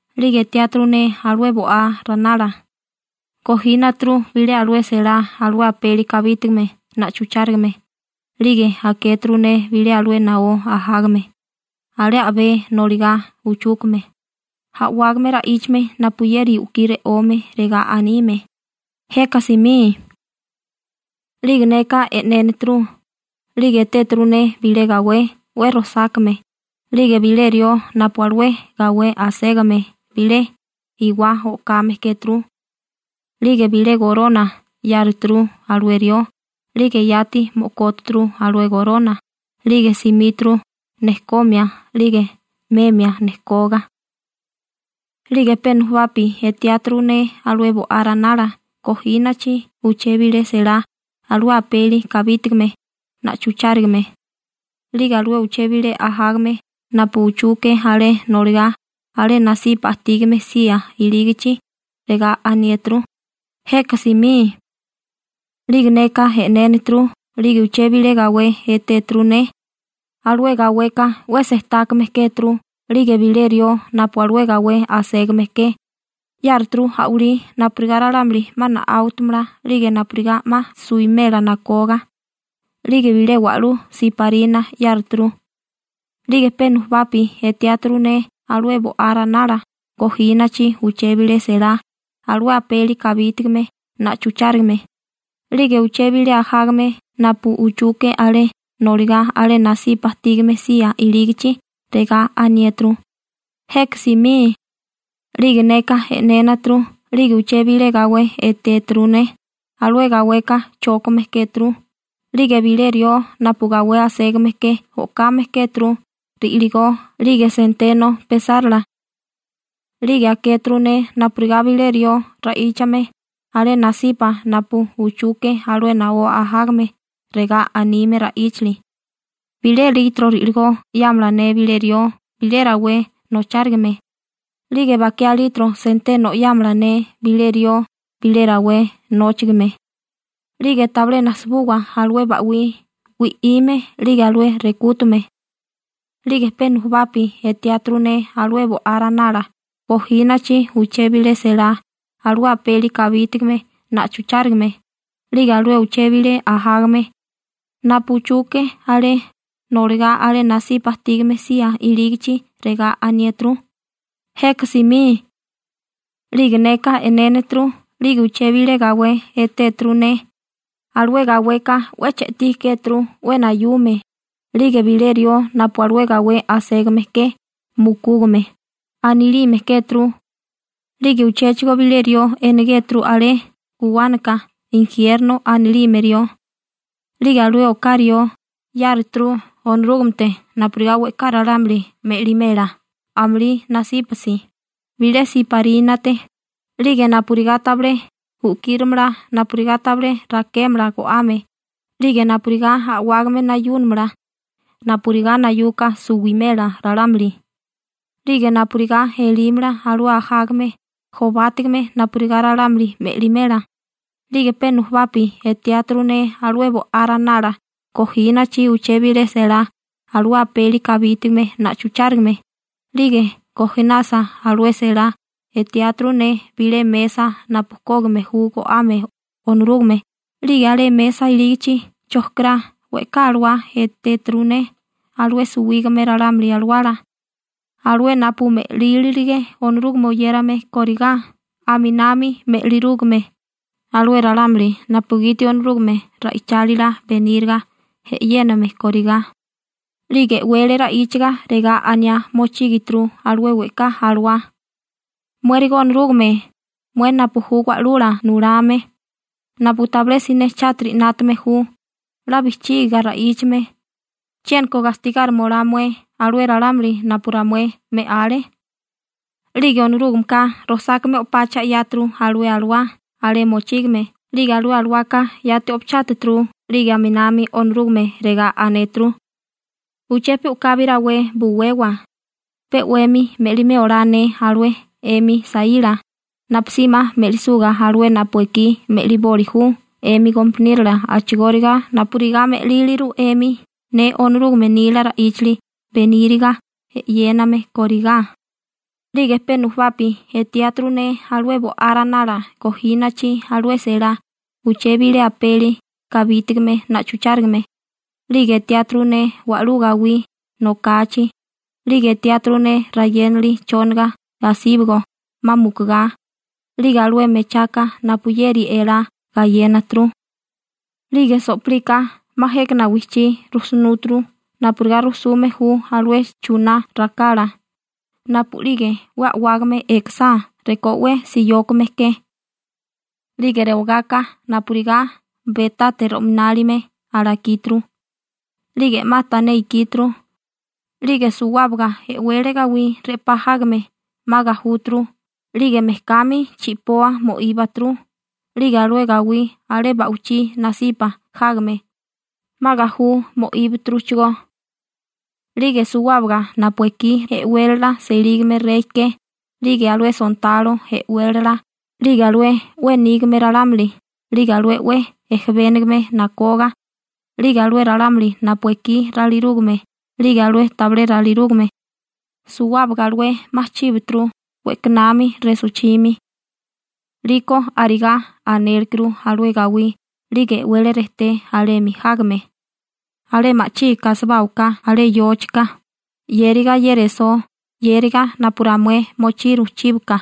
'Lige etiáturu ne alué Bo'á Ranala, gojínaturu bilé alué selá alué apeli kabítigame na'chuchárigame, 'lige akéturu ne bilé alué naó ajágame, alé a'bé noligá uchúkame, a'wágame ra'íchame napuyeri u'kí re'ome, regá anime: ―¡Jeka simí! 'Lige neka e'nénaturu, 'lige etéturu ne bilé gawé 'we rojsákame, 'lige bilé rió napu alué gawé aségame bilé iwá o'kame kéturu. 'Lige bilé gorona 'yáruturu alué rió 'lige yati mo'kóturu alué gorona 'lige simíturu nejkomia 'lige memia nejkoga. 'Lige pe nujubapi etiáturu ne alué Bo'á Ranala gojínachi uché bilé selá alué apeli kabítigame na'chuchárigame, 'lige alué uché bilé ajágame napu uchuke alé noligá alé nasipa ajtígame sía ilígichi, regá aniéturu: ―¡Jeka simí! 'Lige neka e'nénaturu 'lige uché bilé gawé etéturu ne. Alué gaweka 'we sejtákame kéturu 'lige bilé rió napu alué gawé aségame ke 'yáruturu a'walí napurigá ralámuli 'ma na'áwatamala 'lige napurigá 'ma suimela nakoga. 'Lige bilé wa'lú siparina 'yáruturu. 'Lige pe nujubapi etiáturu ne alué Bo'á Ranala gojínachi uché bilé selá alué apeli kabítigame na'chuchárigame, 'lige alué uché bilé ajágame napu uchuke alé noligá alé nasipa ajtígame sía ilígichi, regá aniéturu: ―¡Jeka simí! 'Lige neka e'nénaturu 'lige uché bilé gawé etéturu ne. Alué gaweka chókame kéturu, 'lige bilé rió napu gawé aségame ke o'kame kéturu ri'ligó 'lige senteno pesárala. 'Lige akéturu ne napurigá bilé rió ra'íchame alé nasipa napu uchuke alué naó ajágame, regá anime ra'íchali: ―Bilé litro ri'ligó 'yámala ne bilé rió bilé rawé nochárigame, 'lige bakiá litro senteno 'yámala ne bilé rió bilé rawé nóchigime, 'lige tabilé najsibuwa alué ba'wí wi'ime 'lige alué rekútume. 'Lige pe nujubapi etiáturu ne alué Bo'á Ranala gojínachi uché bilé selá alué apeli kabítigame na'chuchárigame, 'lige alué uché bilé ajágame napu uchuke alé noligá alé nasipa ajtígame sía ilígichi regá aniéturu: ―¡Jeka simí! 'Lige neka e'nénaturu 'lige uché bilé gawé etéturu ne, alué gaweka 'we che'tí kéturu 'we nayume, 'lige bilé rió napu alué gawé aségame ke «Mukúgame» anilime kéturu, 'lige uchéchigo bilé rió enegéturu alé guwánaka «Injiérno» anilime rió. 'Lige alué oká rió 'yáruturu Onorúgamete napurigá we'ká ralámuli me'limela amulí nasípasi, bilé siparínate, 'lige napurigá tabilé u'kíramala napurigá tabilé rakémala go'ame, 'lige napurigá a'wágame nayúnamala napurigá nayuka suwimela ralámuli, 'lige napurigá elímala alué ajágame jobátigame napurigá ralámuli me'limela. 'Lige pe nujubapi etiáturu ne alué Bo'á Ranala gojínachi uché bilé selá alué apeli kabítigame na'chuchárigame, 'lige gojinasa alué selá etiáturu ne bilé mesa napu kógime ju go'ame Onorúgame, 'lige alé mesa ilígichi chojkirá we'ká alawá etéturu ne alué suwígame ralámuli alawala, alué napu me'lílirige Onorúgame oyérame kórigá, aminami me'lirúgame alué ralámuli napugiti Onorúgame ra'ichálila beníriga e'yéname kórigá. 'Lige e'wele ra'íchaga regá aniá mochígituru alué we'ká alawá: ―Muérigo Onorúgame, mué napu ju Wa'lula Nulame, napu tabilé siné chátiri 'nátame ju, 'la bijchígiga ra'íchame, ¿chiéniko gastigárima olá mué alué ralámuli napu ramué me'ale? 'Lige Onorúgameka rojsákame o'pacha 'yáturu alué alawá alé mochígame 'lige alué alawaka yati o'pachátaturu 'lige aminami Onorúgame regá anéturu: ―Uché pe u'kabi rawé buwewa, pe 'wemi me'limé olá ne alué 'emi saíla, napusí 'ma me'lisuga alué napu ekí me'liboli ju 'emi gompaniérola a'chigóriga napurigá me'líliru 'emi ne Onorúgame nila ra'íchali beníriga e'yéname korigá. 'Lige pe nujubapi etiáturu ne alué Bo'á Ranala gojínachi alué selá uché bilé apeli kabítigame na'chuchárigame, 'lige etiáturu ne wa'lú gawí nokachi, 'lige etiáturu ne rayénali chóniga asíbigo 'ma mukugá, 'lige alué mechaka napuyeri elá gayénaturu. 'Lige so'pilika 'ma jékana wijchí rujsunúturu napurigá rujsume ju alué chuná rakala napu'lige 'we a'wágame ekasá rekó 'we siyókame ke. 'Lige rewagáká napurigá betate ro'minálime alakíturu, 'lige 'ma tané ikíturu, 'lige suwábaga e'wele gawí re'pá jágame 'ma gajúturu 'lige mejkami chi'poa mo'íbaturu, 'lige alué gawí alé ba'wichí nasipa jágame 'ma gajú mo'íbaturuchigó. 'Lige suwábaga napu ekí e'wélala selígame rey ke, 'lige alué sontalo e'wélala, 'lige alué 'we nígame ralámuli, 'lige alué 'we ejebénigame nakoga, 'lige alué ralámuli napu ekí ralirúgame 'lige alué tabilé ralirúgame, suwábaga alué 'ma chíbaturu we'kanami resochimi, 'liko arigá anélekuru alué gawí 'lige e'wele rejté alemi jágame: ―Alé ma'chígiká asibáwaká alé yóchika 'yériga ye resó 'yériga napu ramué mochiru chíbaka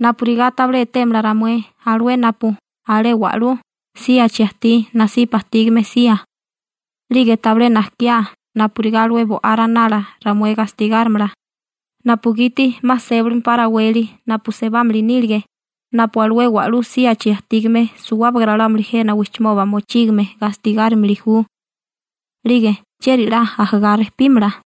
napurigá tabilé etémala ramué alué napu alé wa'lú síachi ajtí nasipa ajtígame sía, 'lige tabilé najkiá napurigá alué Bo'á Ranala ramué gastigárimala, napugiti 'ma sebálimpá raweli napu sebámili nílige napu alué alé wa'lú síachi ajtígame suwábaga ralámuli jena wijchimoba mochígame gastigárimili ju. 'Lige ¿chieri 'la ajagá rejpímala?